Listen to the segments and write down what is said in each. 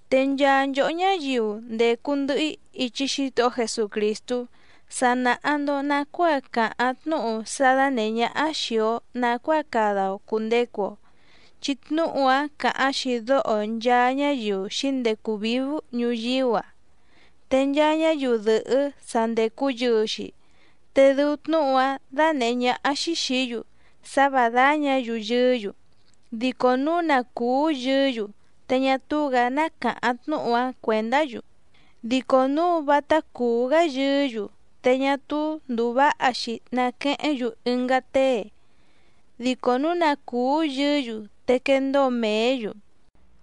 Te nchaa nchòhó ñáyiu ndècu ndɨhɨ‑í ichi Xítohó Jesucrìstú sa nàha‑ndo nacuáa càháⁿ tnúhu sá dánèhé ñáhá xìi‑o nacuáa cada‑o cùndecu‑o, chi tnúhu‑áⁿ càháⁿ‑xi dóho nchaa ñáyiu xǐndecu vǐvú ñuyíú‑a. Te nchaa ñáyiu dɨ̀hɨ́ sa ndècu yɨɨ‑xi, te dɨu tnúhu‑áⁿ dánèhé ñáhá‑xí xìí‑yu sá vǎ dáñǎ‑yu yɨɨ́‑yu, dico núu na cùú yɨɨ́‑yu te ñá túú‑gǎ ná càháⁿ tnúhu‑áⁿ cuèndá‑yu. Dico núu vátá cùú‑gá yɨɨ́‑yu te ñá túú ndùu váha‑xi naquehéⁿ‑yu ɨngá tée, dico núu na cùú yɨɨ́‑yu te quendóo mèé‑yu,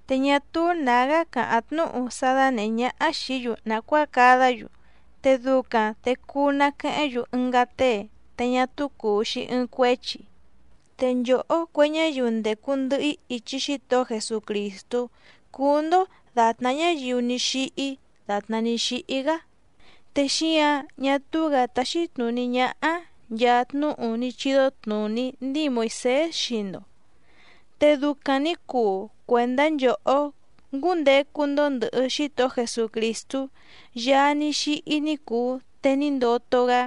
te ñá túú nǎgá càháⁿ tnúhu sá dánèhé ñáhá xìí‑yu nàcuáa cadá‑yu te ducaⁿ te cuu naquehéⁿ‑yu ɨngá tée, te ñá túú cùu‑xi ɨɨⁿ cuéchi. Te nchòhó cue ñáyiu ndècu ndɨhɨ‑í ichi Xítohó Jesucrìstú cúú‑ndó dàtná ñáyiu ní xíhí dàtná ní xíhí‑gá. Te xíǎⁿ ñá túú‑gǎ táxí tnùní ñáhá nchàa tnúhu ní chídó tnùní ndíi Moìsés xii‑ndo. Te ducaⁿ nǐ cuu cuèndá nchòhó ngúndecu‑ndo ndɨ̀hɨ Xítohó Jesucrìstú Yaá ní xíhí ní cùu te ní ndoto‑gá.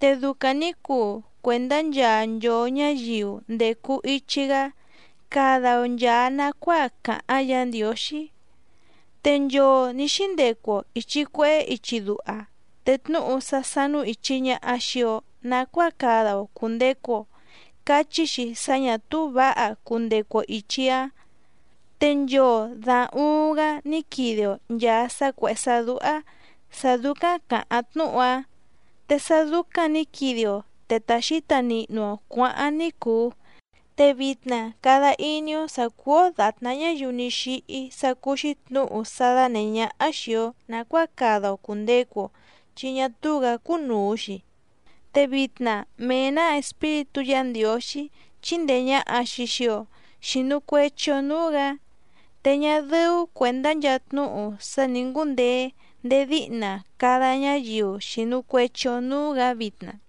Te ducaⁿ nǐ cuu cuèndá nchaa nchoo ñǎyiu ndècu ichi‑gá cada‑o nchàa nacuáa càháⁿ Yǎ Ndiǒxí. Te nchoo nǐ xíndecu‑o ìchi cuehé ichi duha, te tnúhu sá sánú ìchi ñaha xii‑o nacuáa cada‑o cùndecu‑o cachí‑xi sá ñà túú vǎha cundecu‑o ìchi‑áⁿ, te nchoo dà uuⁿ‑gá ní quide‑o nchàa sá cuèhé sá dúhá sǎ dúcáⁿ càháⁿ tnúhu‑áⁿ, te sá dúcáⁿ nǐ quide‑o te ta xǐta nihnu‑o cuǎháⁿ ní cùu. Te vitna cada iní‑ó sǎ cúú‑ó dàtná ñáyiu ní xíhí sá cúú‑xí tnǔhu sá dánèhé ñáhá xìi‑o nacuáa cada‑o cùndecu‑o, chi ñá túú‑gǎ cúnùu‑xi, te vitna mee‑nǎ Espíritú Yǎ Ndiǒxí chíndèe ñaha‑xi xii‑o xinu cuechi‑o núú‑gǎ, te ñá dɨ́ú cuèndá nchaa tnúhu sá nǐ ngúndeé ndéé díhna cada ñáyiu xìnu cuechi‑o núú‑gǎ vitna.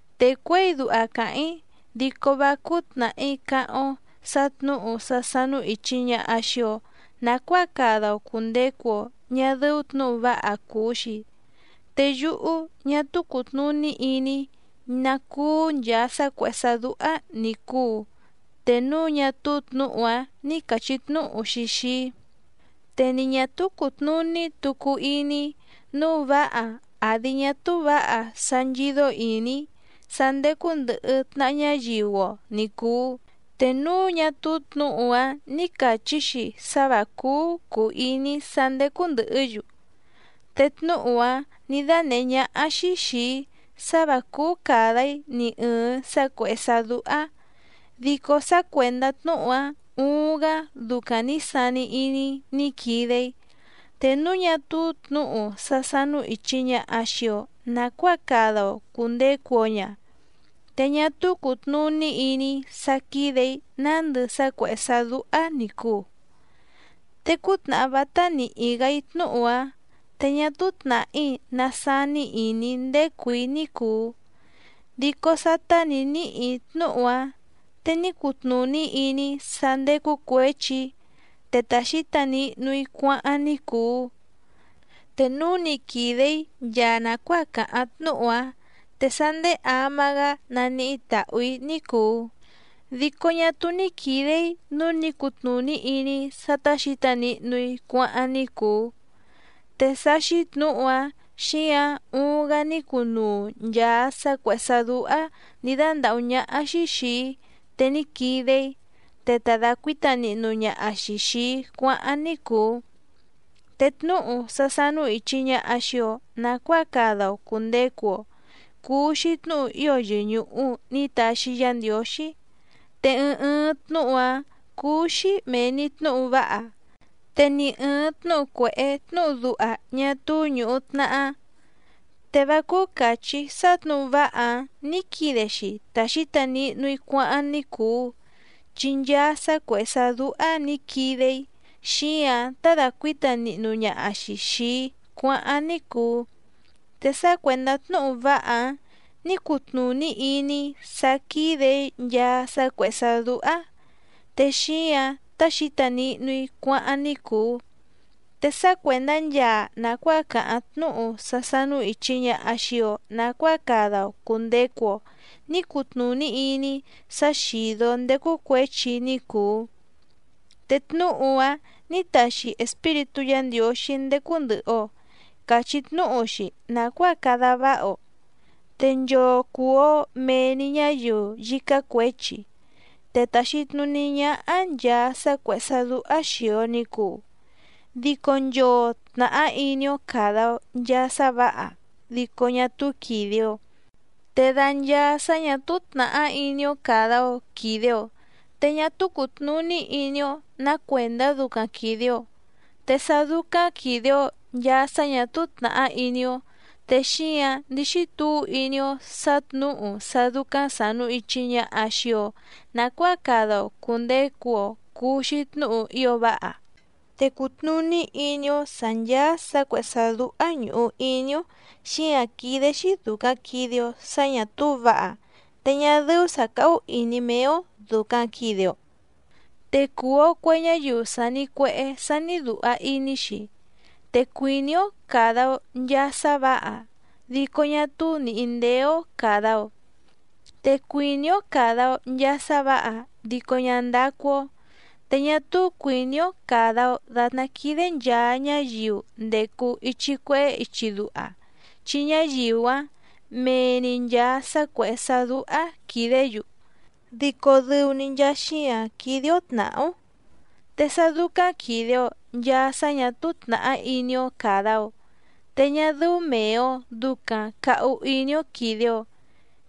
Te cuěi duha càháⁿ‑í dico vá cúú tnàhí cáháⁿ‑ó sǎ tnǔhu sá sánú ìchi ñaha xii‑o nacuáa cada‑o cùndecu‑o ñá dɨ́ú tnǔhu váha cùu‑xi. Te yúhú ñá túú cùtnuní iní‑í ná cúú nchàa sá cuèhé sá dúhá ní cùu te núu ñá túú tnǔhu‑áⁿ ní càchí tnúhu‑xi xii‑í, te ni ñà túú cùtnuní tucu iní‑í nǔu váha àdi ñá túú vǎha sá nchídó ìní‑í sá ndécú ndɨ̀hɨ tnaha ñáyiu‑o ni cùu te núu ñá túú tnǔhu‑áⁿ ní càchí‑xi sá vǎ cúú cùu iní‑í sá ndécú ndɨ̀hɨ́‑yu. Te tnúhu‑áⁿ nǐ dánèhé ñáhá‑xí xìi‑í sá vǎ cúú càda‑í ni ɨ̀ɨⁿ sá cuèhé sá dúhá, dico sá cuèndá tnúhu‑áⁿ uuⁿ‑gá ducaⁿ nǐ sani iní‑í ní quide‑í. Te núu ñá túú tnǔhu sá sánú ìchi ñaha xii‑o nacuáa cada‑o cùndecu‑o ña, te ñá túú cùtnuní iní‑í sá quídè‑í nándɨ sá cuèhé sá dúhá ní cùu. Te cútnàhá vátá nìhí‑gá‑í tnúhu‑áⁿ te ñá túú tnàhí ná sání ìní‑í ndécù‑í ni cùu, dico sátá nì níhì‑í tnúhu‑áⁿ te ní cutnùní iní‑í sá ndécú cuěchi‑í, te ta xǐta nihnu‑í cuáháⁿ ní cùu. Te núu ni quìde‑í nchaa nàcuáa càháⁿ tnúhu‑áⁿ te sa ndéé ama‑gá naníhí tàhú‑í ní cùu, dico ñá túú ní quìde‑í nǔu ní cutnùní iní‑í sá tá xǐta nihnu‑í cuáháⁿ ní cùu. Te sá xíí tnǔhu‑áⁿ xíǎⁿ uuⁿ‑gá ní cunuu nchàa sá cuèhé sá dúhá nǐ dándàhú ñáhá‑xí xìi‑í te ní quide‑í, te ta dàcuíta nihnu ñaha‑xi xìi‑í cuáháⁿ ní cùu. Te tnúhu sá sánú ìchi ñaha xii‑o nacuáa cada‑o cùndecu‑o cuu‑xi tnúhu ío yɨñùhu ní taxi Yá Ndiǒxí, te ɨɨⁿ ɨɨⁿ tnúhu‑áⁿ cúú‑xí mèe‑ni tnúhu váha, te ni ɨ̀ɨⁿ tnúhu cuèhé tnúhu duha ñá túú ñùhu tnahá. Te vá cúú càchí‑í sá tnǔhu váha‑áⁿ nǐ quide‑xi ta xǐta nihnu‑í cuáháⁿ ní cùu, chi nchaa sá cuèhé sá dúhá nǐ quide‑í, xíǎⁿ tá dàcuíta nihnu ñaha‑xi xìi‑í cuáháⁿ ní cùu, te sá cuèndá tnúhu váha‑áⁿ nǐ cutnùní iní‑í sá quídè‑í nchaa sá cuèhé sá dúhá, te xíǎⁿ tá xǐta nihnu‑í cuáháⁿ ní cùu. Te sá cuèndá nchaa nàcuáa càháⁿ tnúhu sá sánú ìchi ñaha xii‑o nacuáa cada‑o cùndecu‑o ní cutnùní iní‑í sá xìdó ndécú cuěchi‑í ní cùu. Te tnúhu‑áⁿ nǐ taxi Espíritú Yǎ Ndiǒxí ndécú ndɨ̀hɨ‑o cachí tnúhu‑xi nàcuáa cada váha‑o. Te nchoo cùu‑o mee‑ni ñáyiu yícá cuěchi, te tàxi tnuní ñáhá nchàa sá cuèhé sá dúhá xìi‑o ni cuu. Dico nchoo tnàhá iní‑ó càda‑o nchaa sá vǎha dico ñá túú quìde‑o, te da nchaa sá ñà túú tnàhá iní‑ó càda‑o quìde‑o, te ñá túú cùtnuní iní‑ó nǎ cuèndá ducaⁿ quìde‑o. Te sá dúcáⁿ quìde‑o nchaa sá ñà túú tnàhá iní‑ó, te xíǎⁿ ndíxí tǔu iní‑ó sǎ tnǔhu sá dúcáⁿ sànu ichi ñaha xii‑o nacuáa cada‑o cùndecu‑o cuu‑xi tnúhu ío váha. Te cùtnuní iní‑ó sǎ nchàa sá cuèhé sá dúhá ñùhu iní‑ó, xíǎⁿ quídé‑xí dùcaⁿ quide‑o sá ñà túú vǎha, te ñá dɨ́ú sǎ cáhú ìní méé‑ó dùcaⁿ quide‑o. Te cùu‑o cue ñáyiu sàni cuehé sání dùha iní‑xi, te cuìní‑ó càda‑o nchaa sá vǎha dico ñá túú nìhí ndéé‑ó càda‑o. Te cuìní‑ó càda‑o nchaa sá vǎha dico ñá ndácú‑ó, te ñá túú cuìní‑ó càda‑o datná quídé nchàa ñáyiu ndècu ichi cuehé ichi duha, chi ñáyiu‑áⁿ mee‑ni nchàa sá cuèhé sá dúhá quìdé‑yu, dico dɨu‑ni nchaa xíǎⁿ quídé‑ó tnàhá‑ó. Te sá dúcáⁿ quìde‑o nchaa sá ñà túú tnàhá iní‑ó càda‑o te ñá dɨ́ú mèe‑o ducaⁿ cahu iní‑ó quìde‑o,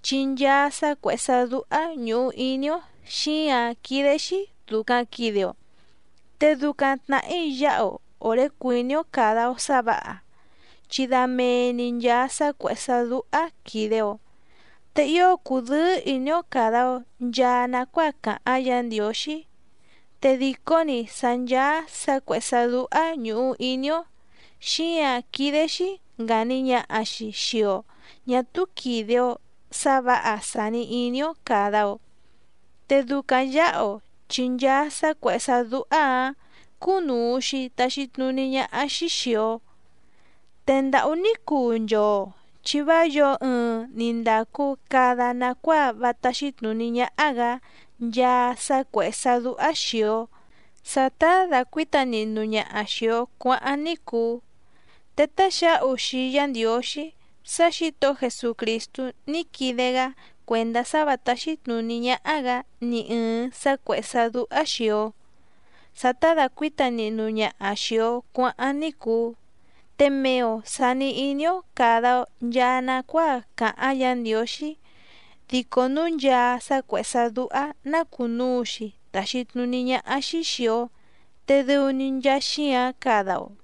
chi nchaa sá cuèhé sá dúhá ñùhu iní‑ó xíǎⁿ quídé‑xí dùcaⁿ quide‑o. Te ducaⁿ tnàhí yáha‑o òré cuìní‑ó càda‑o sá vǎha, chi da mee‑ni nchàa sá cuèhé sá dúhá quìde‑o. Te ío cùdɨ́ɨ́ ìní‑ó càda‑o nchaa nacuáa càháⁿ Yǎ Ndiǒxí, te dìcó‑ni sá ncháá sǎ cuèhé sá dúhá ñùhu iní‑ó, xíǎⁿ quídé‑xí ngàni ñaha‑xi xii‑o ñá túú quìde‑o sá vǎha sàni iní‑ó càda‑o, te ducaⁿ yǎha‑o chi nchaa sá cuèhé sá dúhá‑ǎⁿ cúnùu‑xi taxi tnuní ñáhá‑xí xìi‑o. ¡Te ndàhú ní cuu nchoo! Chi vá yǒo ɨɨⁿ ni ndàcu cada nacuáa vá táxí tnùní ñáhá‑gǎ nchaa sá cuèhé sá dúhá xìi‑o sá tá dàcuíta nihnu ñaha xìi‑o cuáháⁿ ní cùu. Te táxǎhu xii Yá Ndiǒxí sá Xǐtohó Jesucrìstú ní quide‑gá cuèndá sá vǎ táxí tnùní ñáhá‑gǎ ni ɨ̀ɨⁿ sá cuèhé sá dúhá xìi‑o, sá tá dàcuíta nihnu ñaha xìi‑o cuáháⁿ ní cùu. Te mee‑o sàni iní‑ó càda‑o nchaa nacuáa càháⁿ Yǎ Ndiǒxí, dico núu nchaa sá cuèhé sá dúhá ná cùnuu‑xi taxi tnuní ñáhá‑xí xìi‑o, te dɨu‑ni nchaa xíǎⁿ cada‑o.